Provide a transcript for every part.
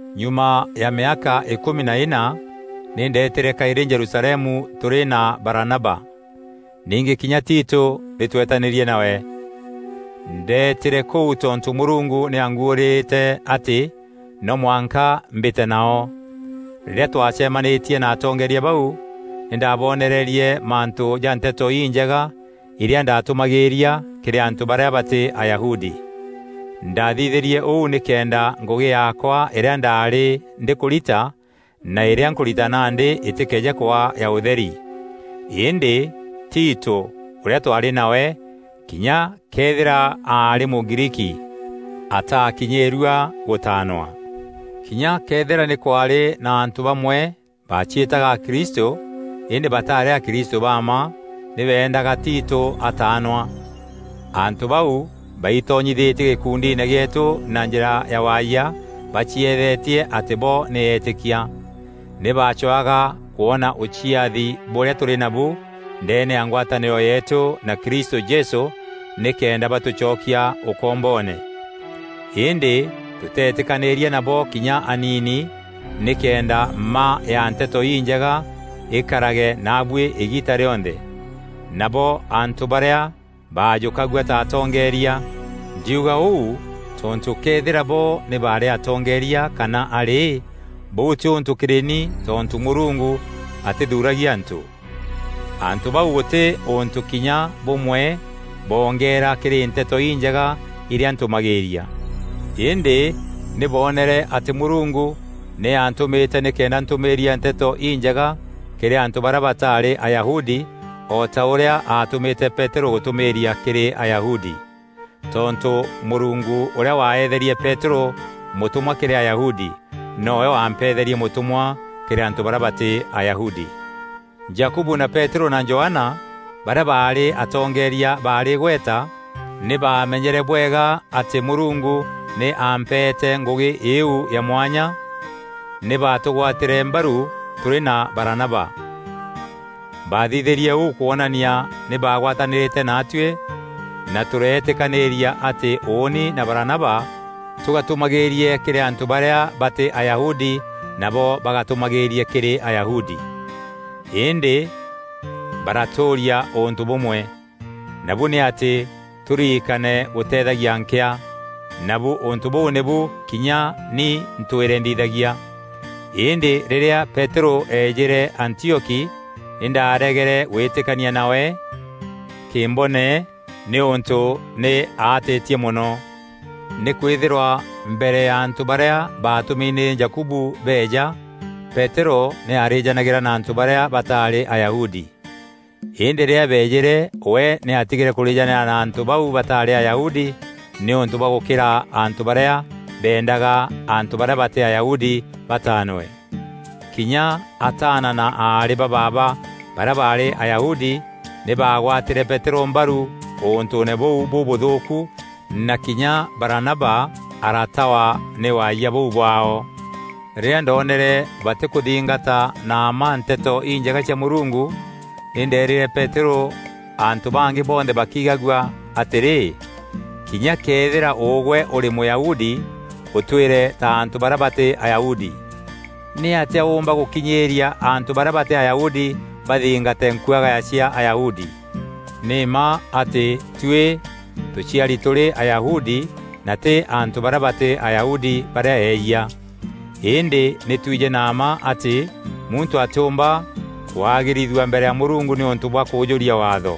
Nyuma ya mîaka îkûmi na îna, nî ndeetîre kaîrî Jerusalemu tûrî na Baranaba. Ningî kinya Tito nî tweetanîrie nawe. Ndeetîre kûu tontû Mûrungu nî aanguûrîrîte atî no mwanka mbîte nao. Rîrîa twacemanîtie na atongeeria bau, nî ndabonereerie mantû ja Nteto Injega irîa ndatûmagîîria kîrî antû barîa batî Ayahudi. Ndaathithîrie ûu nîkenda ngûgî yaakwa îrîa ndaarî ndîkûrita, na îrîa nkûrita nandî îtîkeeje kwaa ya ûtheri. Îndî, Tito ûrîa twaarî nawe, kinya këethîra aarî Mûgriiki ataakinyîîrua gûtaanwa. Kinya këethîra nî kwaarî na antû bamwe baciîtaga akristû, îndî batarî akristû ba mma, nî beendaga Tito ataanwa. Antû bau baitonyithîtie gîkundiine gîetû na njîra ya waayia bacieethetie atî bo nî eetîkia. Nî bacwaga kwona ûciathi bûrîa tûrî nabu ndeene ya ngwatanîro yeetû na Kristû Jesû nîkenda batûcokia ûkomboone. Îndî tûtetîkanîîria nabo kinya aniini, nîkenda mma ya Nteto Injega îkarage naabuî îgiita rîonthe. Nabo antû barîa baajûkagua ta atongeeria (ndiuga ûu tontû këethîra bo nî baarî atongeeria kana arî, bûu tî ûntû kîrî ni tontû Mûrungu atîthuragia antû.) Antû bau gûtî ûntû kinya bûmwe bongeera kîrî Nteto Injega irîa ntûmagîîria. Îndî nî boonere atî Mûrungu nî aantûmîte nîkenda ntûmîîria Nteto Injega kîrî antû barîa bataarî Ayahudi o ta ûrîa atûmîte Peterû gûtûmîîria kîrî Ayahudi. Tontû Mûrungu ûrîa waeetherie Peterû mûtûmwa kîrî Ayahudi, nowe wampeetherie mûtûmwa kîrî antû barîa batî Ayahudi. Jakubu na Peterû na Johana, barîa baarî atongeria baarî îgweta, nî baamenyere bwega atî Mûrungu nî aampeete ngûgî îîu ya mwanya, nî batûgwatîre mbaru tûrî na Baranaba. Baathithîrie ûû kwonania nî baagwatanîrîte naatûî na tûreetîkanîîria atî ûûni na Baranaba tûgatûmagîîrie kîrî antû barîa batî Ayahudi nabo bagatûmagîîrie kîrî Ayahudi. Îndî baratûûria ûntû bûmwe: nabu nî atî tûririkane gûteethagia nkîa, nabu ûntû bûu nîbu kinya ni ntwîre nthithagia. Îndî rîrîa Peterû eejîre Antioki, nî ndaaregere gwîtîkania nawe kîmbone nîûntû nî aatîtie mono. Nîkwîthîrwa mbere ya antû barîa baatûmi nî Jakubu beeja, Peterû nî aarîjanagîra na antû barîa bataarî Ayahudi. Îndî rîrîa beejîre we nî aatigîre kûrîjanîra na antû bau bataarî Ayahudi nîûntû bwa gûkîra antû barîa beendaga antû barîa batî Ayahudi bataanwe. Kinya ataana na aarî ba baaba barîa barî Ayahudi nî bagwatîre Peterû mbaru ûntûûne bûu bûbûthûûku na kinya Baranaba aratawa nî waayia bûu bwaao. Rîrîa ndoonere batîkûthingata na mma Nteto Injega cia Mûrungu, nî ndeerîre Peterû antû bangî bonthe bakigagua atîrî, “Kinya këethîra ûgwe ûrî Mûyahudi, ûtwîre ta antû barîa batî Ayahudi! Nîatîa ûûmba gûkinyîîria antû barîa batî Ayahudi bathingate nkuagaya cia Ayahudi?” Nî mma atî tuî tûciari tûrî Ayahudi na tî antû barîa batî Ayahudi barîa eeyia. Îndî nî twijî na mma atî muntû atîûmba kwagîrithua mbere ya Mûrungu nîûntû bwa kûûjûria Waatho,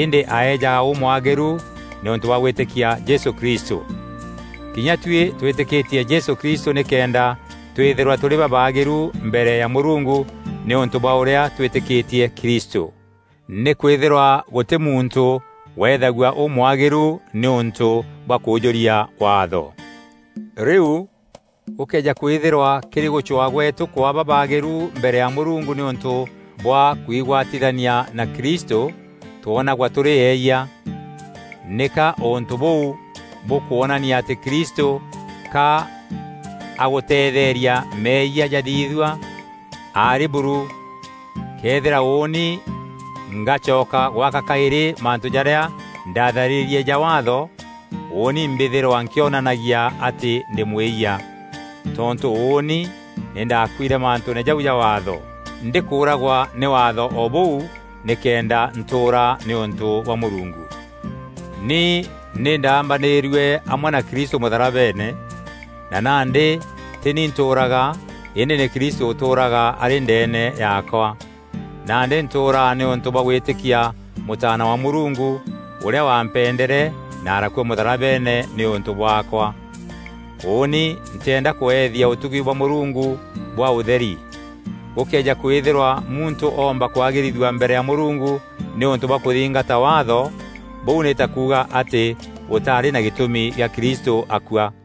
îndî aejaga ûmwagîru nîûntû bwa gwîtîkia Jesû Kristû. Kinya tuî twîtîkîtie Jesû Kristû nîkenda twîthîrwa tûrî babaagîru mbere ya Mûrungu nîûntû bwa ûrîa twîtîkîtie Kristû. Nîkwîthîrwa gûtî muntû wethagua ûmwagîru nîûntû bwa kûûjûria Waatho. Rîu, gûkëeja kwîthîrwa kîrî gûcwaa gweetû kwaa babaagîru mbere ya Mûrungu nîûntû bwa kwigwatithania na Kristû twonagwa tûrî eeyia, nîka ûntû bûu bûkwonania atî Kristû ka agûteetheeria meeyia jathithua? Arî buru! Këethîra ûûni ngacoka gwaka kaîrî mantû jarîa ndaatharîrie ja Waatho, ûûni mbîthîrwa nkîonanagia atî ndî mwîyia. Tontû ûûni nî ndaakuîre mantûûne jau ja Waatho, ndî kûragwa nî Waatho o bûu, nîkenda ntûûra nîûntû bwa Mûrungu. Ni nî ndaambanîîrue amwe na Kristû mûtharabeene, na nandî tî ni ntûûraga îndî nî Kristû ûtûûraga arî ndeene yaakwa. Nandî ntûûraga nîûntû bwa gwîtîkia Mûtaana wa Mûrungu ûrîa wampendere na arakua mûtharabeene nîûntû bwaakwa. Ûûni ntîenda kweethia ûtugi bwa Mûrungu bwaa ûtheri. Gûkeeja kwîthîrwa muntû oomba kwagîrithua mbere ya Mûrungu nîûntû bwa kûthingata Waatho, bûu nî ta kuuga atî gûtarî na gîtûmi gîa Kristû akua.